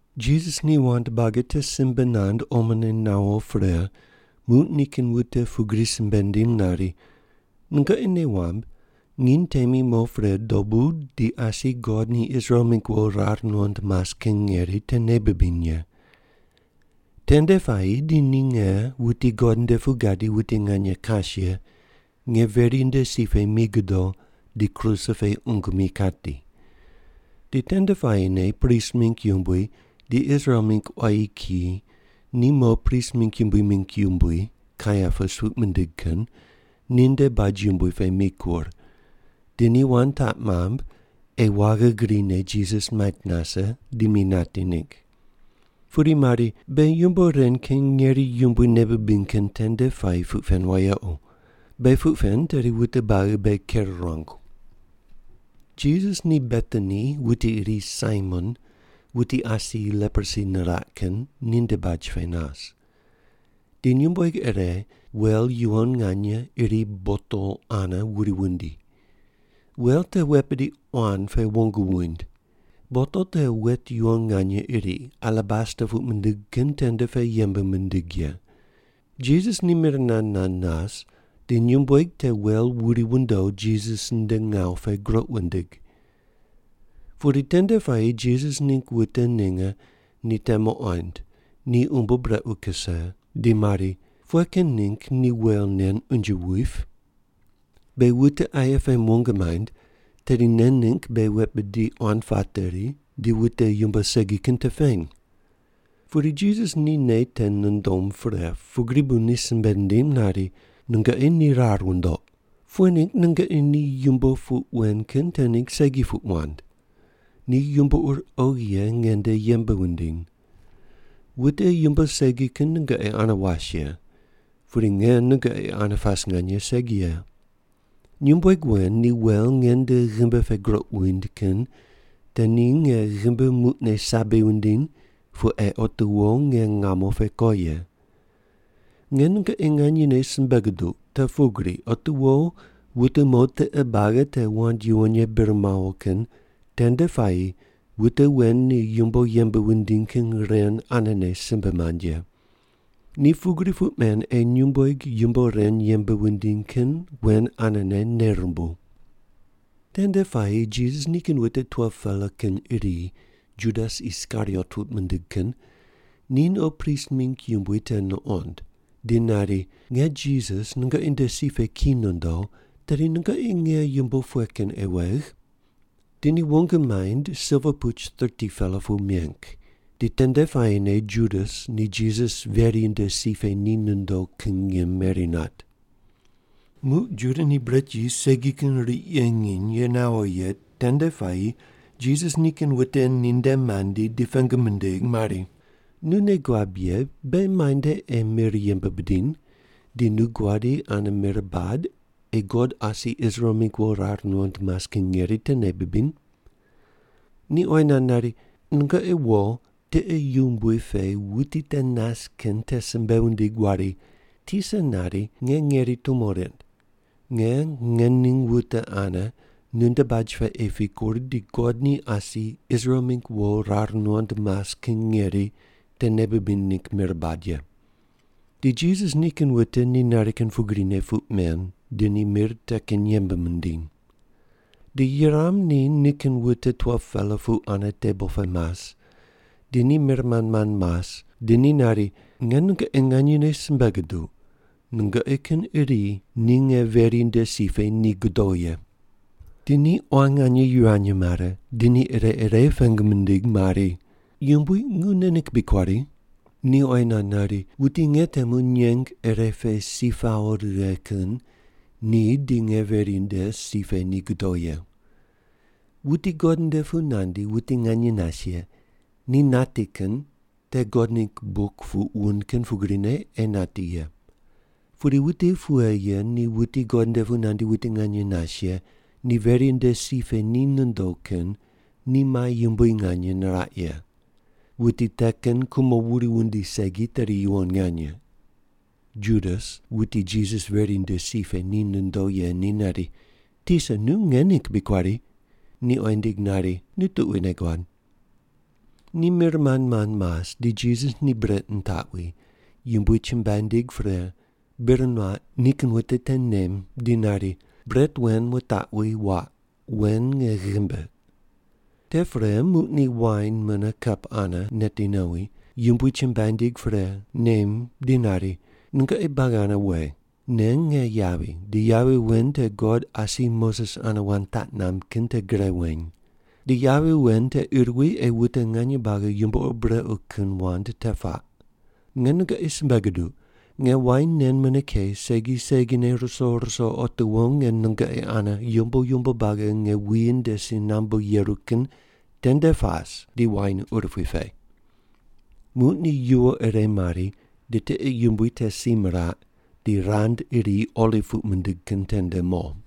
Jisas ni wand buagi te simbe nand omone nawo pre, muq nikin wute pugri simbe nindim nari, “Nungoqi nei wamb nginy temi mo pre dobu di asi God ni Israel mingg wo rar nuqond mas kin ngeri te nei bibiny ye. Tende puayi di ni nge, wuti God nde pu gadi wuti nganye kas ye, nge veri nde si pe mi godo, di kruse pe qungu mi kati.” Di tende puayine prist mingg yumbui di Israel mingg quayi kiyi ni mo prist mingg yumbui mingg yumbui, Kaiapas puq mindig kin, ninde baj yumbui pe mikur, di ni wand taq mamb ei waghi grine Jisas mait nase, di mi nati ningg. Pudi mari, “Beghi yumbo ren kin ngeri yumbui nei bibiny kin tende puayi puq pen wayequ. Beghi puq pen tedi wute buagi beghi ker ruangu.” Jisas ni Betani wuti iri Saimon, wuti asi leprosi niraq kin, ninde baj pe nas. Di nyumbueg ire wel yuwon nganye iri botol ane wuri wundi. Wel te wet bidi quan pe wong wuind. Botol te wet yuwon nganye iri, alabasta puq mindig kin tende pe yembe mindig ye. Jisas ni mir nand nand nas di nyumbueg te wel wuri wundo, Jisas nde ngawu pe groq wundig. Pudi tende puayi Jisas ningg wute ninge ni te muqond, ni umbo brequ kuse, di mari, “Pughe kin ningg ni wel nen unje wuip? Beghi wute aye pem wong maind, tedi nen ningg beghi wet bidi quan pateri, di wute yumbo segi kin te peny.” Pudi Jisas ni nei te nundom pre, pugri bu ni simbe nindim nari, “Nungoqi ni rar wundoq. Pughe ningg nungoqi ni yumbo puq wen kin te ningg segi puq wand? Ni yumbo ur oghi ye nge nde yembe wundiny. Wute yumbo segi kin nungoqi ane was ye, pudi nge nungoqi ane pas nganye segi ye. Nyumbueg wen ni wel nge nde ghimbi pe groq wuind kin te ni nge ghimbi muqne sabi wundiny pu ei otiwo nge ngamo pe ko ye. Nge nungoqi nganyene simbe guduq te pugri otiwo wute mo tiqe buagi te wand yuwon ye bir mawo kin tende puayi wute wen ni yumbo yembe wundiny kin ren anene simbe mand ye. Ni pugri puq men ei nyumbueg yumbo ren yembe wundiny kin wen anene nei rumbuw.” Tende puayi Jisas nikin wute 12-pela kin iri, Judas Iskariot puq mindig kin, ni no prist mingg yumbui te nuqond, di nari, “Nge Jisas nungoqi nde si pe ki nondo, tedi nungoqi nge yumbo pughe kin ei wegh?” Di ni wong maind silva puch 30-pela pu meng. Di tende puayine Judas ni Jisas veri nde si pe ni nondo kin ngim meri nat. Muq Juda ni bret yis segi kin riq ye nginy ye nawo ye tende puayi Jisas nikin wute ninde mandi di pengu mindig mari, “Nu nei guab ye beghi muainde ei mir yembe bidiny, di nu guadi ane mir bad ei God asi Israel mingg wo rar nuqond mas kin ngeri te nei bibiny?” Ni oyi nand nari, “Nungoqi wo, tiqe yumbui pe wuti te nas kin te simbe wundig wari, ‘Tisa nari, nge ngeri tumo rind. Nge ngening wute ane nunde baj pe ei pikur di God ni asi Israel mingg wo rar nuqond mas kin ngeri te nei bibiny ningg mir bad ye’.” Di Jisas nikin wute ni nari kin pugrine puq men, di ni mir te kin yembe mindiny. Di yuram ni nikin wute 12-pela pu ane tebol pe mas, di ni mir mand mand mas di ni nari, “Nge nungoqi nganyene simbe guduq, nungoqi kin iri ni nge veri nde si pe ni godo ye.” Di ni quan nganye yivany mare, di ni ire ire pengu mindig mari, “Yumbui, nu nge ningg bri kuari?” Ni oyi nand nari, “Wuti nge temu nyeng ire pe si pawo righe kin ni di nge veri nde si pe ni godo ye. Wuti God nde pu nandi wuti nganye nas ye ni nati kin te God ningg buk puq wund kin pugrine ei nati ye. Pudi wuti pughe ye ni wuti God nde pu nandi wuti nganye nas ye ni veri nde si pe ni nondo kin ni mai yumbui nganye niraq ye. Wuti te kin kumo wuri wundi segi tedi yuwon nganye.” Judas wuti Jisas veri nde si pe ni nondo ye ni nari, “Tisa, nu nge ningg bri kuari?” Ni oyi nindig nari, “Nu tuquine guad.” Ni mir mand mand mas, di Jisas ni bret nitaqwi, Yumbui chumbuai nindig pre, bir nuaq nikin wute te nem di nari, “Bret wen wutaqwi waq, wen nge ghimbi.” Te pre muq ni wain mune kap ane neti nowi, Yumbui chumbuai nindig pre, nem di nari, “Nungoqi buagi ane we. Nen nge yavi di yavi wen te God asi Moses ane wand taq mamb kin te gre weny. Di yavi wen te ir wi ei wute nganye buagi yumbo ur brequ kin wand te puaq. Nge nungoqi simbe guduq, nge wain nen mune ke segi segine ruso ruso otiwo nge nungoqi ane yumbo yumbo buagi nge wuyi nde si nambu yeru kin tende pas di wain urupui pe.” Muq ni yuwo ire mari di tiqe yumbui te si miraq, di rand iri Oliv puq mindig kin tende mo.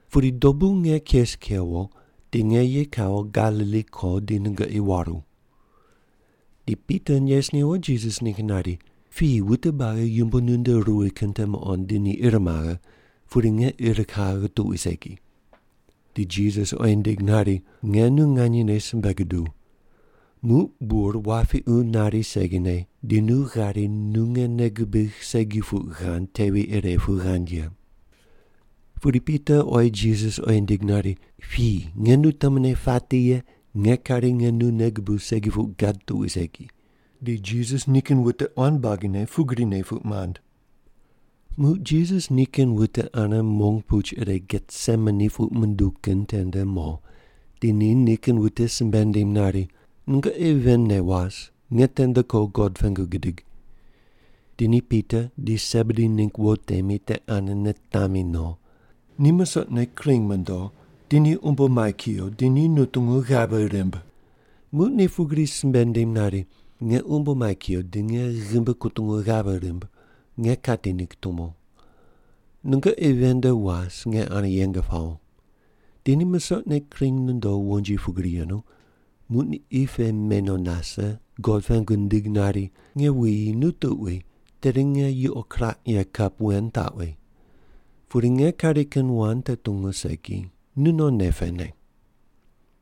Pudi dobu nge kes kewo, di nge ye kawo Galili ko di nungoqi waru.” Di Pita nes newo Jisas ningg nari, “Piyi wute buagi yumbo nunde ruwi kin te muqond di ni ir maghe, pudi nge ir kaghe tuqui segi.” Di Jisas oyi nindig nari, “Nge nu nganyene simbe guduw, muq bur wapiqu nari segine di nu ghari nu nge nei gubigh segi puq ghand tevi ire pu ghand ye.” Pudi Pita oyi Jisas oyi nindig nari, “Piyi, nge nu temune pati ye, nge kari nge nu nei gubuw segi ye puq gad tuqui segi.” Di Jisas nikin wute quan buagine pugrine puq mand. Muq Jisas nikin wute ane mong puch ire Getsemani puq munduw kin tende mo, di ni nikin wute simbe nindim nari, “Nungoqi ven ne was, nge tende ko God pengu gidig.” Di ni Pita di Sebedi ningg wo temi te ane nitami no. Ni misoqne kring mondo, di ni umbo mai kuyo, di ni nutungu ghave rimb. Muq ni pugri simbe nindim nari, “Nge umbo mai kuyo di nge ghimbi kutungu ghave rimb, nge kati ningg tumo. Nungoqi ven nde was nge ane yeng pawo.” Di ni musoqne kring nondo wonji pugri yenu, muq ni qi pe me no nase, God pengu nindig nari, “Nge wuyi, nu tuqui tedi nge yuqo kiraq ye kap wen taqwi. Pudi nge kari kin wand te tungu segi, nu non nei pene.”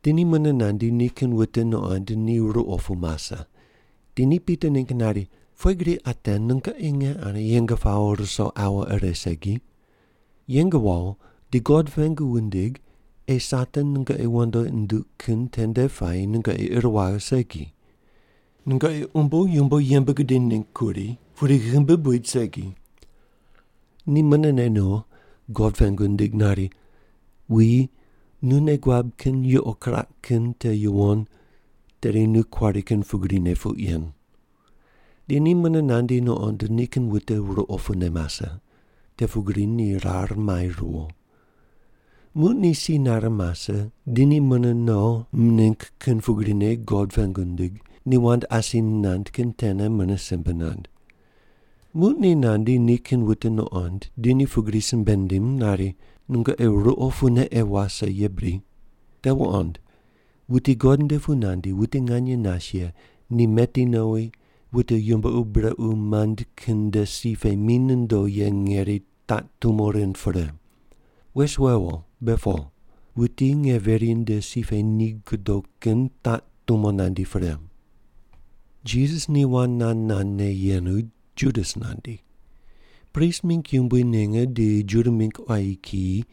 Di ni mune nandi, nikin wute nuqond ni ruqo pu mase, di ni Pita ningg nari, “Pughe gri ate nungoqi nge ane yeng pawo ruso aua ire segi? Yeng wawo, di God pengu wundig ei Satan nungoqi wandoqi nunduq kin tende puayi nungoqi ir waghe segi. Nungoqi umbo yumbo yembe gudiny ningg kuri, pudi ghimbi buid segi.” Ni munene no God pengu nindig nari, “Wuyi, nu nei guab kin yuqo kiraq kin te yuwon, tedi nu kuari kin pugrine puq yen.” Di ni mune nandi nuqond nikin wute ruqo pune mase. Te pugri ni rar mai riwo. Muq ni si nare mase, di ni mune no mining kin pugrine God pengu nindig, ni wand asi nand kin tene mune simbe nand. Muq ni nandi nikin wute nuqond, di ni pugri simbe nindim nari, “Nungoqi ruqo pune ei wase ye bri? Te wuqond, wuti God nde pu nandi wuti nganye nas ye ni meti nowi wute yumbo ur brequ mand kin nde si pe mi nondo ye ngeri taq tumo rind pre. Wes wewo, be po. Wuti nge veri nde si pe ni godo kin taq tumo nandi pre.” Jisas ni wand nand nandne yenu, Judas nandi. Prist mingg yumbui ninge di Juda mingg quayi kiyi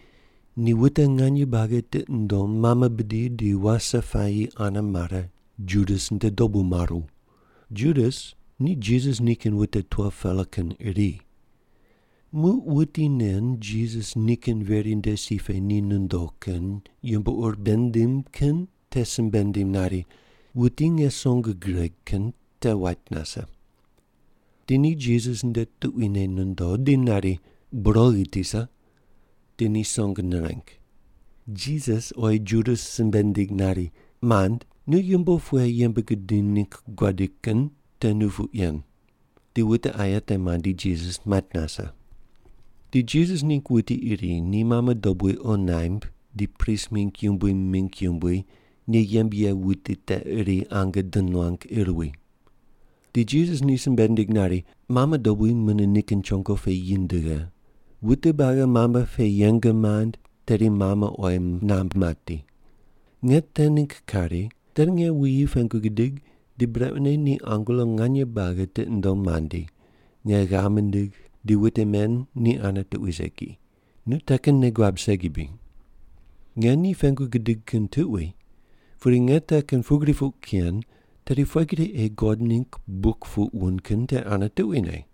ni wute nganye buagi tiqi mundom mame bidi di wase puayi ane mare Judas nde dobu maru. (Judas ni Jisas nikin wute 12-pela kin iri.) Muq wuti nen Jisas nikin veri nde si pe ni nondo kin yumbo ur bei nindim kin te simbe nindim nari, “Wuti nge song gireg kin te wait nase.” Di ni Jisas nde tuquine nondo di nari, “Bur oghi Tisa!” Di ni song nireng. Jisas oyi Judas simbe nindig nari, “Mand, nu yumbo pughe yembe gudiny ningg guadi kin te nu puq yen.” Di wute aye te mandi Jisas mait nase. Di Jisas ningg wuti iri ni mame dobui qo naimb di prist mingg yumbui mingg yumbui ni yembe ye wuti te iri ange di nuang ir wi. Di Jisas ni simbe nindig nari, “Mame dobui mune nikin chongo pe yi ndighe. Wute buagi mame pe yeng mand tedi mame oyi namb mati. Nge te ningg kari, tedi nge wuyi pengu gidig di brequne ni angelo nganye buagi tiqi nundom mandi, nge ghav mindigh di wute men ni ane tuqui segi. Nu te kin nei guab segi bri? Nge ni pengu gidig kin tuqui, pudi nge te kin pugri puq ken, tedi pughe gri ei God ningg buk puq wund kin te ane tuquine?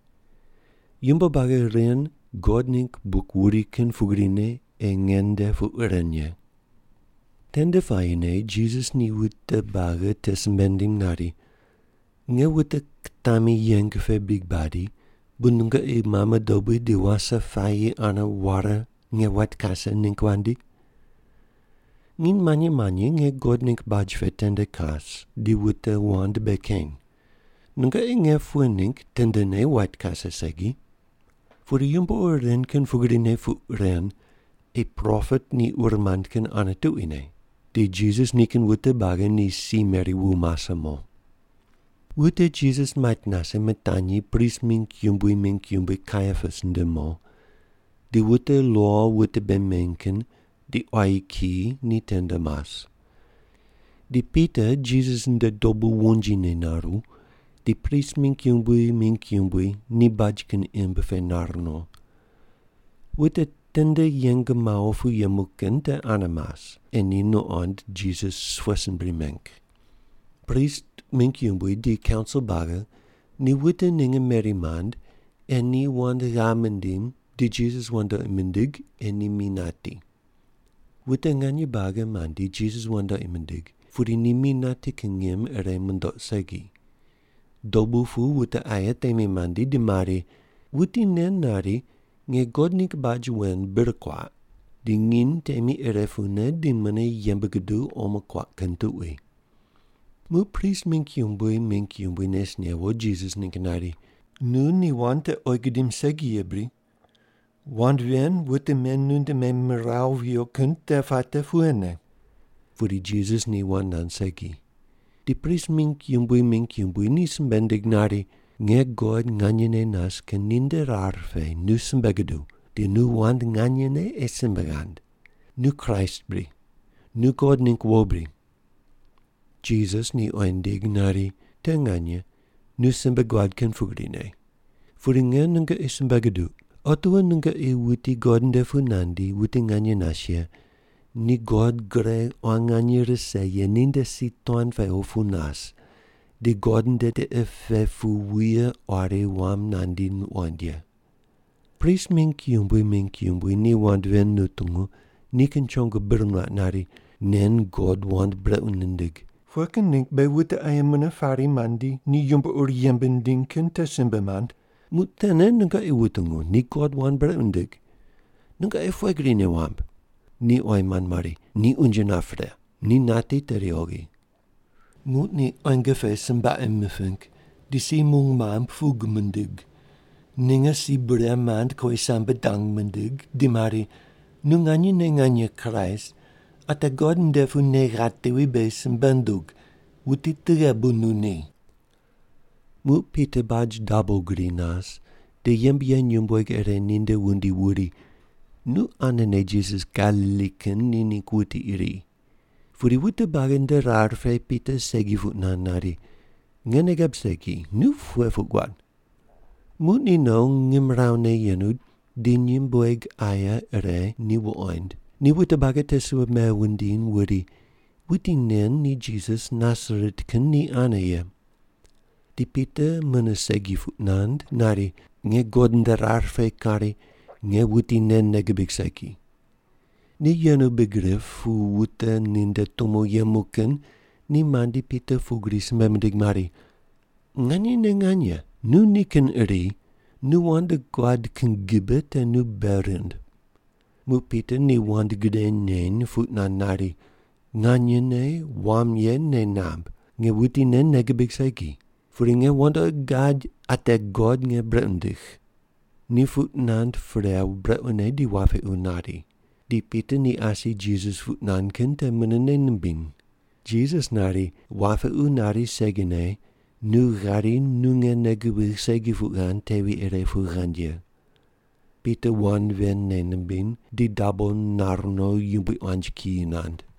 Yumbo buagi ren God ningg buk wuri kin pugrine ei nge nde puq ren ye.” Tende puayine Jisas ni wute buagi te simbe nindim nari, “Nge wute kitami yeng pe bri badi bu nungoqi mame dobui di wase puayi ane ware nge wait kase ningg wandi? Nginy manyi manyi nge God ningg baj pe tende kas di wute wand bei keny. Nungoqi nge pughe ningg tendene wait kase segi? Pudi yumbo ur ren kin pugrine puq ren ei propet ni ur mand kin ane tuquine.” Di Jisas nikin wute buagi ni si meri wu mase mo. Wute Jisas mait nase mitanyi prist mingg yumbui mingg yumbui Kaiapas nde mo, di wute lo wute bei meny kin di quayi kiyi ni tende mas. Di Pita Jisas nde dobu wonjine naru, di prist mingg yumbui mingg yumbui ni baj kin imb pe nar no. Wute tende yeng mawo pu yemu kin te ane mas, ei ni nuqond Jisas pughe sin bri meng. Prist mingg yumbui di kaunsil buagi ni wute ninge meri mand ei ni wand ghav mindim di Jisas wandoqi mindig ei ni mi nati. Wute nganye buagi mandi Jisas wandoqi mindig, pudi ni mi nati kin ngim ire mundoq segi. Dobu pu wute aye temi mandi, di mari, “Wuti nen nari, ‘Nge God ningg baj wen bir kuaq di nginy temi ire pune di mune yembe guduw omo kuaq kin tuqui’.” Muq prist mingg yumbui mingg yumbui nes newo Jisas ningg nari, “Nu ni wand te oyi gudim segi ye bri? Wand ven wute men nunde memiraw viyo kin te puate pughene?” Pudi Jisas ni wand nand segi. Di prist mingg yumbui mingg yumbui ni simbe nindig nari, “Nge God nganyene nas kin ninde rar pe nu simbe guduw, di nu wand nganyene ei simbe ghand. Nu Kraist bri? Nu God ningg wo bri?” Jisas ni oyi nindig nari, “Te nganye, nu simbe guad kin pugrine. Pudi nge nungoqi simbe guduq. Otiwo nungoqi wuti God nde pu nandi wuti nganye nas ye ni God gre quan nganye rise ye ninde si tuan pe opu nas di God nde tiqe pe pu wuye quari wam nandi wuqoind ye.” Prist mingg yumbui mingg yumbui ni wand ven nutungu, nikin chongo bir nuaq nari, “Nen God wand brequ nindig. Pughe kin ningg beghi wute aye mune pari mandi ni yumbo ur yembe nindiny kin te simbe mand? Muq tene nungoqi wutungu ni God wand brequ nindig. Nungoqi pughe gri nei wamb?” Ni oyi mand mari, “Ni unje nap pre, ni nati tedi oghi.” Muq ni quenge pe sombaqe miping, di si mung mamb pug mindig. Ninge si bure mand kowisambe dang mindig, di mari, “Nu nganyene nganye Kraist, ate God nde pu nei ghatevi beghi simbe ndug, wuti tughe bu nu ni?” Muq Pita baj dabo gri nas, di yembe ye nyumbueg ire ninde wundi wuri, “Nu anene Jisas Galili kin ni ningg wuti iri.” Pudi wute buagi nde rar pe Pita segi puq nand nari, “Nge nei gab segi, nu pughe puq guad.” Muq ni no, ngimrawu ne yenu di nyumbueg aye ire ni wuqoind, ni wute buagi te simbe wundiny wuri, “Wuti nen ni Jisas Nasaret kin ni ane ye.” Di Pita mune segi puq nand nari, “Nge God nde rar pe kari nge wuti nen nei gibig segi!” Ni yenu big rip pu wute ninde tumo yemu kin ni mandi Pita pugri simbe mindig mari, “Nganyene nganye, nu nikin iri. Nu wand guad kin gibe te nu bei rind.” Muq Pita ni wand gre neny, puq nand nari, “Nganyene wam ye nei namb, nge wuti nen nei gibig segi. Pudi nge wandoqi gad ate God nge brequ nindigh.” Ni puq nand pre brequne di wapiqu nari. Di Pita ni asi Jisas puq nand kin te mune nei nimbiny. Jisas nari, “Wapiqu nari segine nu ghari nu nge nei gubigh segi puq ghand tevi ire pu ghand ye.” Pita wand ven nei nimbiny, di dabo nar no, yumbui quanji kiyi nand.